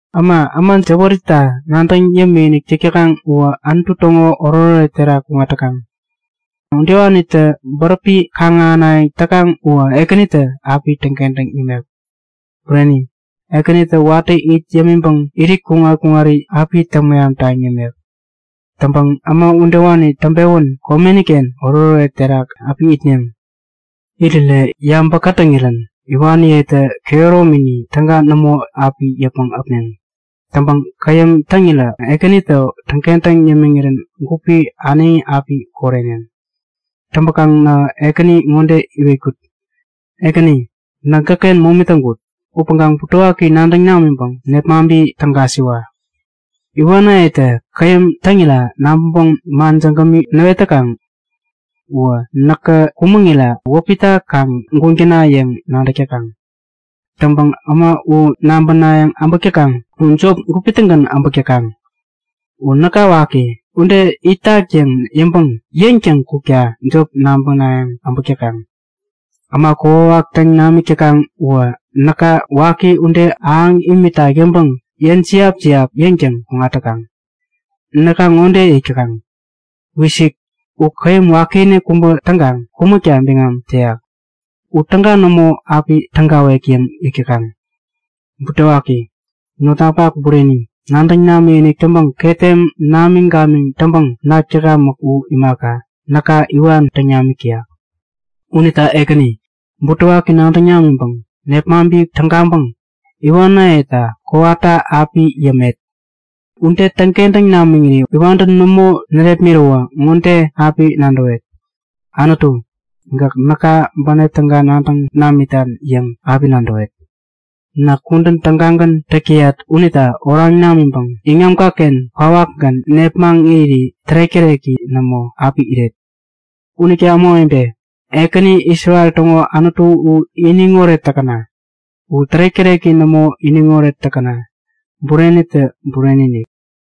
Äma, äma jäwärita nadäŋ yämik täkaŋ uwä Anutu täŋo oretoret terak kuŋat täkaŋ. Udewanitä bäräpi kaŋ-ahänayäŋ täkaŋ uwä Ekänitä api täŋkentäŋ yämek. Bureni, Ekänitä watä it yämiŋpäŋ irit kuŋat-kuŋari api täŋ-mehamtaŋ yämek. Täŋpäŋ äma udewani täŋpewän komeniken oretoret terak api itneŋ. Irirä yabä kätäŋirän iwaniyetä kehäromini täga nämo api yäpmäŋ äpneŋ. Täŋpäŋ käyäm täŋirä Ekänitä täŋkentäŋ yämiŋirän gupi äneŋi api koreneŋ. Täŋpäkaŋ nähä Ekäni ŋode iwetkut; Ekäni, näk gäkken momi täŋkut. Upäŋkaŋ butewaki nadäŋ namiŋpäŋ nepmaŋpi tägasiwa. Iwanayetä käyäm täŋira nabäŋpäŋ man jägämi näwet täkaŋ. Uwä näkä kumäŋira wäpita kaŋ guŋ täna yäŋ nadäk täkaŋ. Täŋpäŋ äma u nabänayäŋ äbäk täkaŋ u jop gupi-tägän äbäk täkaŋ. U näka waki ude itak yäŋ yäŋpäŋ yäŋtäŋ kukta jop nabänayäŋ äbäk täkaŋ. Äma kokwawak täŋ namik täkaŋ uwä näka waki ude ahäŋ imitak yäŋpäŋ yäŋjiap-jiap yäŋtäŋ kuk täkaŋ. Näka ŋode yäk täkaŋ; Wisik! U käyäm wakiinik kubä täŋkaŋ kumäkta biŋam täyak. U täga nämo api tägawek yäŋ yäk täkaŋ. Butewaki! Notnapak bureni, nadäŋ imikinik täŋpäŋ ketem namiŋ-gamiŋ täŋpäŋ nak täkamäk u imaka, näka iwan täŋ namik täyak. Unita Ekäni, butewaki nadäŋ namiŋpäŋ nepmaŋpi tägaŋpäŋ iwanayeta kowata api yämet. Ude täŋkentäŋ namiŋiri iwantä nämo närepmiräwä ŋode api nadäwet; Anutu, gäk näka bänep täga nadäŋ namitan yäŋ api nadäwet. Näk kudän tägagän täk täyat unita oraŋ namiŋpäŋ iŋamkaken kwawakgän nepmaŋ iriri tärek-täreki nämo api iret. Unita ämawebe, Ekäni, Isrel täŋo Anutu u iniŋoret täkäna! U tärek-täreki nämo iniŋoret täkäna! Burenitä bureni-inik!